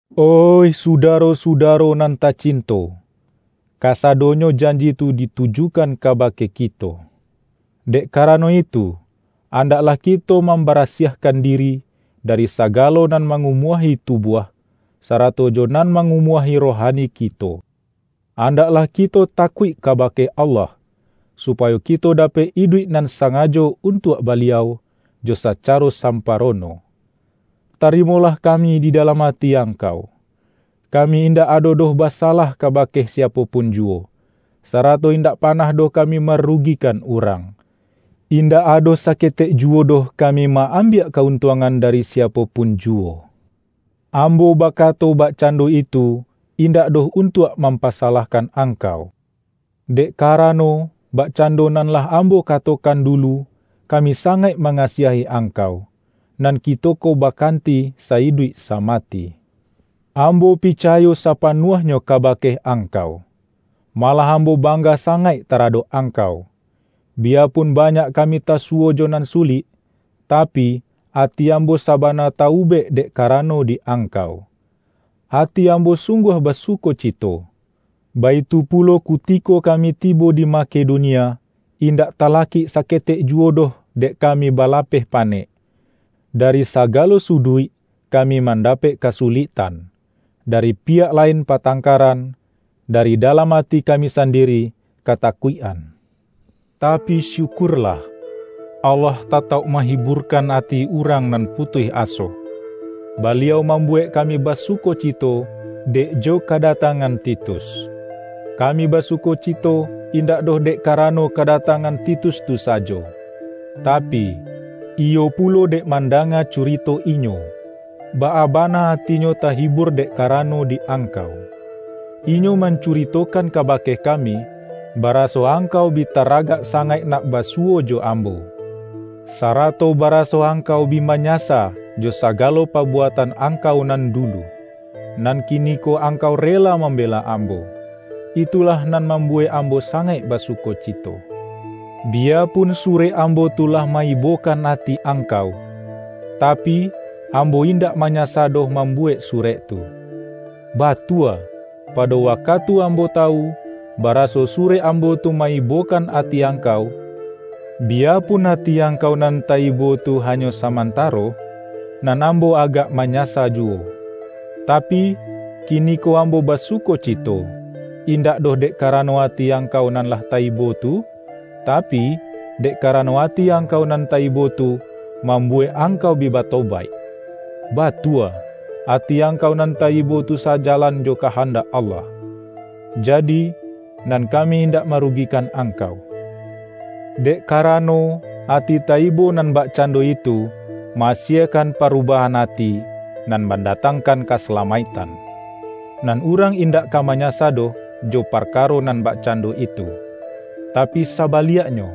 Oih sudaro-sudaro nan tacinto! Kasadonyo janji tu ditujukan ka-bake kito. Dek karano itu, andaklah kito mambarasiahkan diri, dari saga-lo nan mangumuahi tubuah, sarato jo nan mangumuahi rohani kito. Andak-lah kito takuik kabake Allah, supayo kito dapek iduik nan sangajo untuak Baliau, jo sacaro samparono. Tarimolah kami di dalam ati ang-kau. Kami indak ado doh basalah ka-bake siapo pun juwo, sarato indak pa-nah doh kami marugikan urang. Indak ado saketek juwo doh kami ma-am-biak ka-untuangan dari siapo pun ju-wo. Ambo bakato bakcando itu, indak doh untuak mampasalahkan angkau. Dek karano, bakcando nan lah am-bo katokan dulu, kami sangaik ma-ngasiahi angkau, nan kito ko bakanti sa-iduik samati. Ambo picayo sapanuahnyo kabake angkau. Malah am-bo bangga sangaik taradok angkau! Biyapun banyak kami tasuwo jo nan sulik, tapi, ati ambo sabana ta-ubek dek karano di angkau. Ati ambo sung-guah basukocito! Baitu pulo kutiko kami tibo di Ma-kedonia, indak talakik saketek juwo doh dek kami balapeh panek. Dari sagalo suduik kami mandapek kasu-liktan: dari piyak lain patangkaran, dari dalam ati kami sandiri, kata-kuik-an. Tapi syukurlah, Allah ta-tauk mahiburkan ati urang nan putuih aso; Baliau mambuwek kami basuko-cito, dek jo kadatangan Titus. Kami basukocito indak doh dek karano ka-datangan Titus tu sajo, tapi, iyo pulo dek mandanga curito inyo, baa bana atinyo tahibur dek karano di angkau. Inyo mancuritokan kabake kami, bara-so angkau bi taragak sangaik nak ba-suwo jo ambo; sarato baraso angkau bi manyasa jo sagalo pabuatan ang-kau nan dulu, nan kiniko angkau rela mambela ambo. Itulah nan mambu-wek ambo sangaik basukocito. Biyapun surek ambo tu lah ma-ibo-kan ati angkau, tapi, ambo indak ma-nyasa doh mambuwek surek tu. Batua, pado wakatu ambo tawu, baraso surek ambo tu ma-ibokan ati angkau - bi-yapun ati angkau nan ta-ibo tu hanyo samantaro-nan ambo agak manya-sa juwo. Tapi, kiniko ambo basuko-cito - indak doh dek karano ati ang-kau nan lah ta-ibo tu, tapi, dek karano ati angkau nan ta-ibo tu, mambuwek angkau bi batobaik. Batua, ati ang-kau nan ta-ibo tu sajalan jo kahandak Allah. Jadi, nan kami indak marugi-kan angkau. Dek karano, ati ta-ibo nan bakcando itu, ma-asiekan paru-bahan ati, nan mandatangkan kasa-lamaiktan. Nan urang indak ka ma-nyasa doh jo parkaro nan bakcando itu. Tapi sabaliaknyo,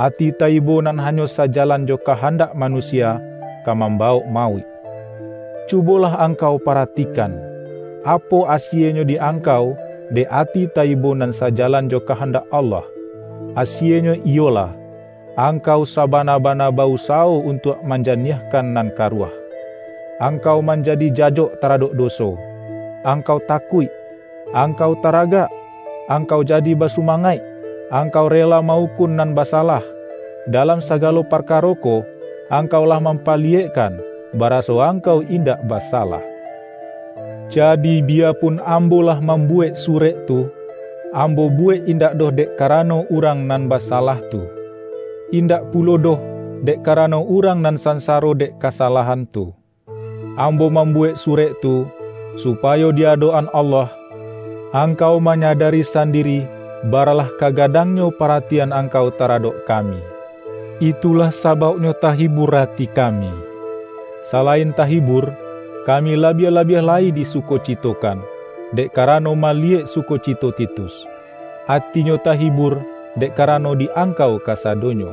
ati ta-ibo nan hanyo sajalan jo kahandak manusia, ka mambawok mauik. Cubolah ang-kau paratikan, apo asienyo di ang-kau dek ati ta-ibo nan sajalan jo ka-handak Allah! Asienyo iyolah, angkau sabana-bana ba-usawo untuak manja-niahkan nan karuah! Angkau manja-di jajok taradok doso, angkau takuik, angkau taragak, angkau jadi basuma-ngaik, angkau rela ma-ukun nan basa-lah! Dalam sagalo parkaro ko, angkau lah mampaliyekkan baraso angkau in-dak basalah. Jadi, biyapun ambo lah mambu-wek surek tu, ambo buwek indak doh dek karano urang nan basalah tu. In-dak pulo doh, dek karano urang nan sansaro dek kasalahan tu. Ambo mam-buwek surek tu, supayo di adok-an Allah, angkau manyadari sandiri bara-lah kagadangnyo paratian angkau tara-dok kami. Itulah sabauknyo tahibur ati kami. Salain tahibur, kami labiah-labiah lai disukocitokan, dek karano maliyek sukocito Titus; atinyo tahi-bur dek karano di angkau kasadonyo.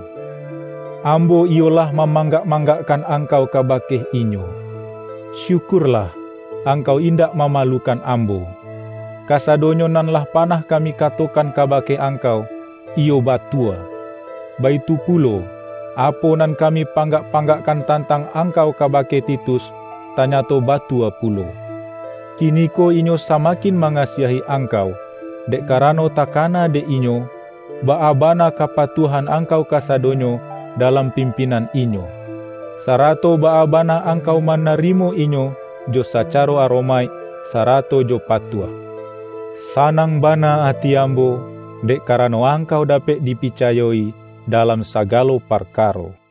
Ambo iyo lah mamanggak-manggak-kan angkau kabake inyo. Syukurlah, angkau indak mamalukan ambo. Ka-sadonyo nan lah panah kami katokan kabake angkau, iyo batua. Baitu pulo, apo nan kami panggak-panggakkan tantang angkau kabake Titus, tanya-to batua pulo. Kiniko inyo sama-kin mangasiahi angkau, dek karano takana dek inyo, baa bana kapatuah-an angkau kasadonyo dalam pimpin-an inyo, sarato baa bana angkau ma-narimo inyo jo sacaro aromaik, sarato jo patuah. Sanang bana ati ambo, dek karano angkau dapek dipicayo-i dalam sagalo parkaro.